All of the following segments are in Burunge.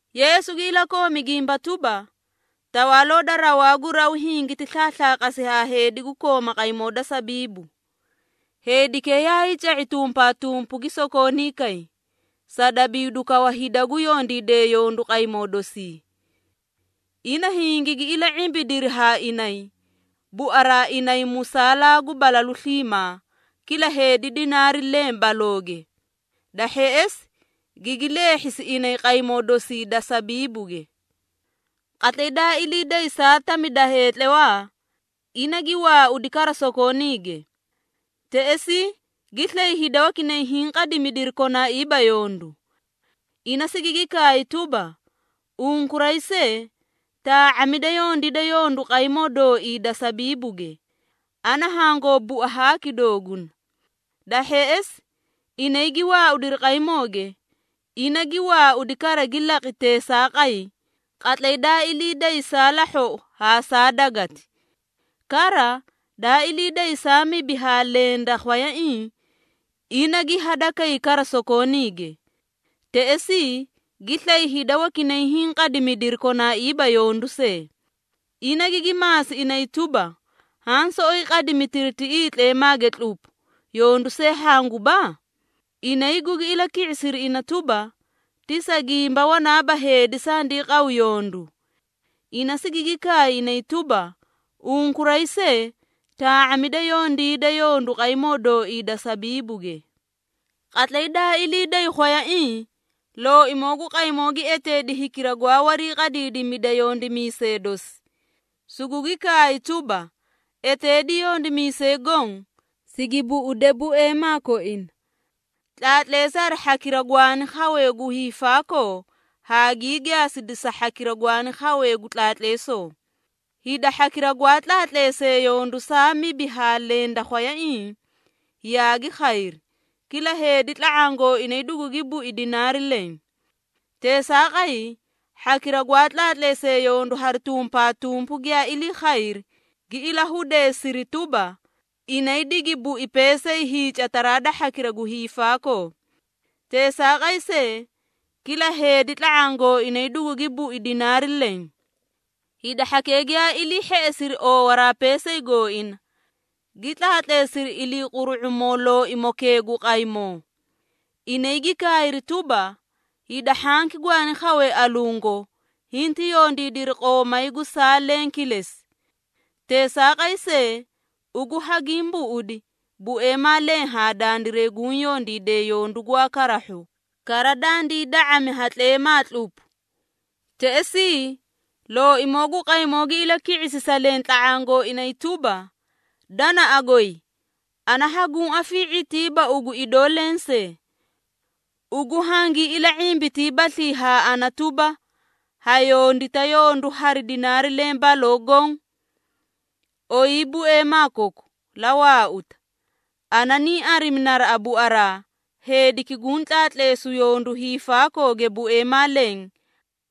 Yeesu gi ilakoomi gimba tuba, “Tawaaloo da rawaa gu raw hingiti slaaslaaqasi ha heedi gu kooma qaymoo da sabiibu. Heedikee yaay ca⁄i tumpaatumpu gi sokoonii kay, sa dabiidu kawa hida gu yondiidee yondu qaymoo dosii. Ina hingigi ila⁄imbidiri haa inay, buaraa inay musaalaa gu balalu sliimaa, kila heedi dinaari leẽ balooge. Da hheꞌesi, gigi leehhisi inay qaymoo dosii da sabiibuge. Qatlay daa ilii day saa tami da heetlawaa, ina gi waaudi kara sokooniige. Teꞌesii, gi slay hida wakinay hiĩ qadimidiri konaaiiba yondu. Ina sigigi kaay tuba, ‘Unkuray see, taa⁄amida yondiida yondu qaymoo dooii da sabiibuge, ana hangoo bua haaki dooguna.’ Da hheꞌesi, inay gi waaudiri qaymooge. Ina gi waaudi kara gi laqi teesaaqay, qatlay daa ilii day saa lahhoꞌo haa saa dagati. Kara, daa ilii day saa mibi haa leẽ da khwayaiĩ, ina gi hadakay kara sokooniige. Teꞌesii, gi slay hida wakinay hiĩ qadimidiri konaaiiba yondu see. Ina gigi maasi inay tuba, ‘Haã soꞌoyi qadimitiri tiꞌii tleemaage tlupu, yondu see hanguba?’ Inay gugi ilaki⁄isiri ina tuba, ‘Ti sa gimba wanaaba heedi sandii qawu yondu.’ Ina sigigi kaay inay tuba, ‘Unkuray see, taa⁄amida yondiida yondu qaymoo dooii da sabiibuge.’ Qatlay daa ilii day khwayaiĩ, looimoo gu qaymoo gi eteedi hikira gwaa wariiqadiidimida yondimiisee dosi, sugugi kaay tuba, ‘Eteedi yondimiisee goõ, sigi buꞌude bueemaa koina. Tlaatleesi hari hhakira gwaani khawee gu hiifaakoo, haa gii gaasida sa hhakira gwaani khawee gu tlaatleesoo.’ Hida hhakira gwaa tlaatleesee yondu saa mibi haa leẽ da khwayaiĩ, yaagi khayri, kila heedi tla⁄aã gooinay dugugi bui dinaari leẽ. Teesaaqay, hhakira gwaa tlaatleesee yondu hari tumpaatumpu giyaa ilii khayri, gi ilahudeesiri tuba, inay digi bui peesay hiicataraa da hhakira gu hiifaakoo. Teesaaqay see, kila heedi tla⁄aã gooinay dugugi bui dinaari leẽ. Hida hhakee giyaa ilii hheꞌesiri oowaraa peesay gooina, gi tlaatleesiri iliiquru⁄umoo looimokee gu qaymoo. Inay gi kaayri tuba, ‘Hida hhanki gwaani khawee alungo, hinti yondiidiri qoomay gu saa leẽ kilesi. Teesaaqay see, ugu hagiĩ buꞌudi, bueemaa leẽ haa dandiray guũ yondiidee yondu gwaa karahhu, kara dandii da⁄ami ha tleemaa tlupu!’ Teꞌesii, looimoo gu qaymoo gi ilaki⁄isi sa leẽ tla⁄aã gooinay tuba, ‘Danaꞌa goy, ana hanguũ afii⁄itiiba ugu idoo lensee. Ugu hangii ila⁄imbitiibaslii haa ana tuba, ha yondita yondu hari dinaari leẽ baloo goõ? Oyii bueemaa koku, la waauta. Ana niĩ arimi naraꞌa buaraa, heediki guũ tlaatleesu yondu hiifaakooge bueemaa leẽ,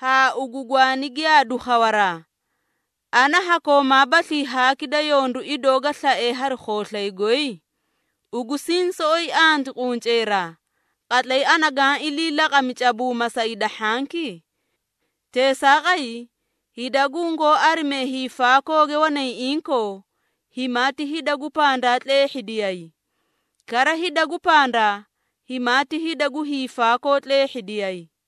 haa ugu gwaani giyaadu khawaraa. Ana ha koomaabaslii haaki da yondu idoo ga slae hari khooslay goy? Ugu siĩ soꞌoyi anti qunceeraa, qatlay ana gaã ilii laqami cabuuma sa hida hhanki? Teesaaqay, hida gungoó arimee hiifaakooge wanay inkoo, himaati hida gu pandaa tleehhidiyay, kara hida gu pandaa, himaati hida gu hiifaakoo tleehhidiyay.’”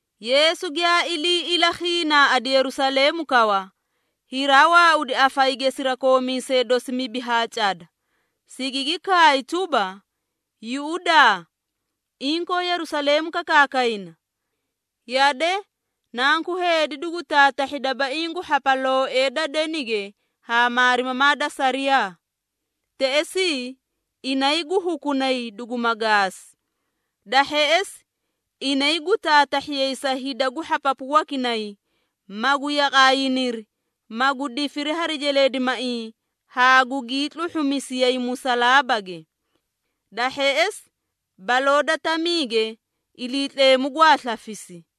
Yeesu giyaa ilii ilakhiinaaꞌadi Yerusaleemu kawa, hiraa waaudi afayige sirakoomiisee dosi mibi haa cada, sigigi kaay tuba, “Yuꞌudaa, inkoo Yerusaleemu kakaakayna. Yade, Nanku Heedi dugu taatahhi dabaiĩ gu hhapalooee da denige haa maarimamaa da sariyaa. Teꞌesii, inay gu hukunay duguma gaasi. Da hheꞌesi, inay gu taatahhiyay sa hida gu hhapapu wakinay, magu yaqaayiniri, magu difiri hari jeleedimaiĩ haa gugii tluhhumisiyay musalaabage. Da hheꞌesi, baloo da tamiige Iliitleemu gwaa slafisi.”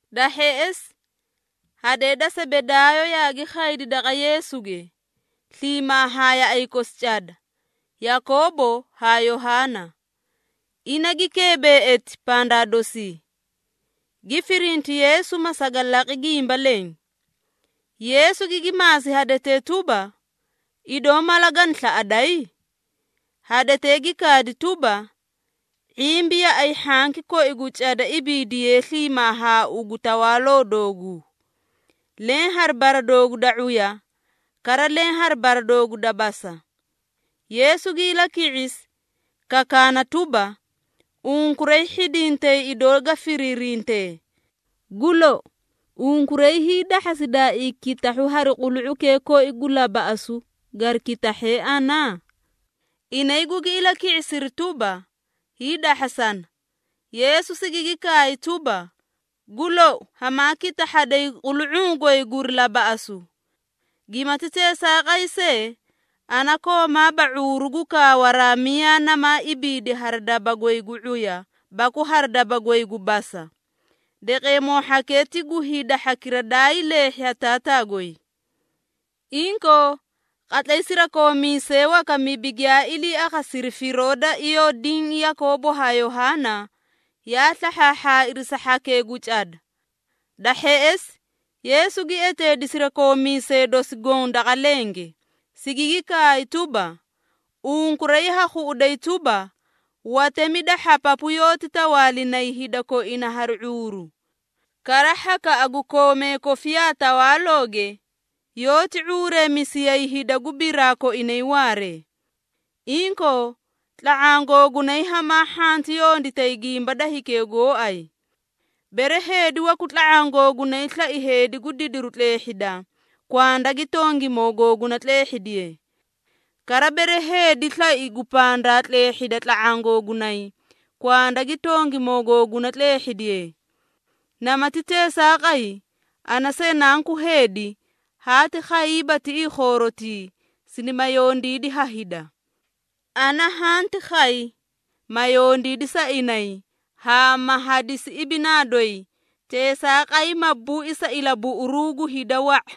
Da hheꞌesi, hadee da Sebedaayo yaagi khaydi daqa Yeesuge, sliimaa haa yaꞌay kosi cada, Yakoobo haa Yohaana. Ina gi keebeꞌeti pandaa dosii, gi firinti Yeesu ma saga laqi gimba leẽ. Yeesu gigi maasi hadetee tuba, “Idoo mala gana slaꞌaday?” Hadetee gi kaadi tuba, “⁄imbi yaꞌay hhanki koi gu cada ibiidiyee sliimaa haa ugu tawaaloo dooguu, leẽ hari bara doogu da ⁄uya, kara leẽ hari bara doogu da basa.” Yeesu gi ilaki⁄isi, kakaana tuba, “Unkuray hhidintay idoo ga firiirintee. Gu lou, unkuray hiidahhasidaaii kitahhu hari qulu⁄ukee koi gu labaꞌasu gari kitahhe ana?” Inay gugi ilaki⁄isiri tuba, “Hiidahhasana.” Yeesu sigigi kaay tuba, “Gu lou, hamaa kitahhaday qulu⁄uu goy guri labaꞌasu. Gimati teesaaqay see, ana koomaaba ⁄uuru gu kaawaraa miyaa namaa ibiidi hari daba goy gu ⁄uya baku hari daba goy gu basa. Deqeemoo hhakee ti gu hida hhakira daay leehhi ha Taataa goy.” Inkoo, qatlay sirakoomiisee waka mibi giyaa ilii akhasiri firoo da iyoo diĩ Yakoobo haa Yohaana, yaa slahhaahhaairi sa hhakee gu cada. Da hheꞌesi, Yeesu gi eteedi sirakoomiisee dosi goõ daqa lenge, sigigi kaay tuba, “Unkuray ha khuꞌuday tuba, watemi da hhapapu yoóti tawaalinay hida koina hari ⁄uuru. Kara, hhakaꞌa gu koomee kofiyaa tawaalooge, yoóti ⁄uureemisiyay hida gu biraa koinay waaree. Inkoo, tla⁄aã googunay hamaa hhanti yonditay gimba da hikee gooay. Bere heedi waku tla⁄aã googunay slai heedi gu didiru tleehhida, kwanda gi tongimoo googuna tleehhidiye. Kara, bere heedi slai gu pandaa tleehhida tla⁄aã googunay, kwanda gi tongimoo googuna tleehhidiye. Namati teesaaqay, ana see Nanku Heedi haati khayiiba tiꞌii khoorotii, sinima yondiidi ha hida. Ana hanti khay, ma yondiidi sa inay, haa ma hadisi ibinaa doyi, teesaaqay ma bui sa ilabuꞌuruu gu hida wa⁄a.”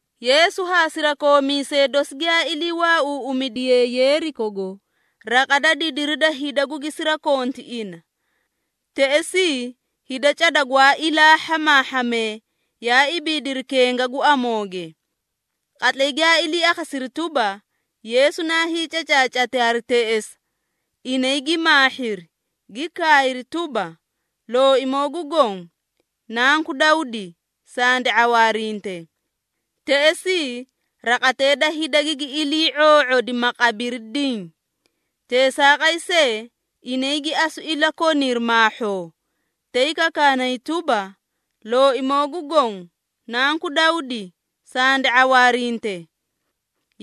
Yeesu haa sirakoomiisee dosi giyaa ilii waauuꞌumidiyee Yeerikogo, raqa da didiri da hida gugi sirakonti ina. Teꞌesii, hida cada gwaa ilaa hhamaahhamee, yaa ibiidiri kenga gu amooge. Qatlay giyaa ilii akhasiri tuba, Yeesu naa hiicacaacati hari teꞌesa, inay gi maahhiri, gi kaayri tuba, “Looimoo gu Goõ, Nanku Dawdi, sandi ⁄awaarinte.” Teꞌesii, raqatee da hida gigi ilii⁄oo⁄odi, ma qabiri diĩ. Teesaaqay see, inay gi asu ilakoniri maahhoo, tay kakaanay tuba, “Looimoo gu Goõ, Nanku Dawdi, sandi ⁄awaarinte!”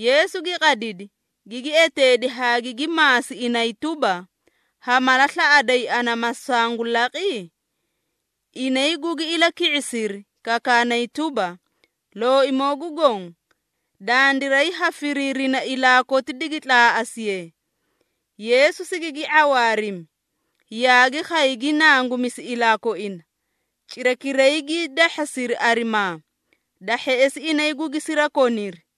Yeesu gi qadidi, gigi eteedi haa gigi maasi inay tuba, “Ha mala slaꞌaday ana ma sangu laqi?” Inay gugi ilaki⁄isiri, kakaanay tuba, “Looimoo gu Goõ, dandiray ha firiirina ilaa koti digi tlaaꞌasiye.” Yeesu sigigi ⁄awaarimi, yaagi khay gi nangumisi ilaa koina, cirakiray gii dahhasiri arimaa, da hheꞌesi inay gugi sirakoniri.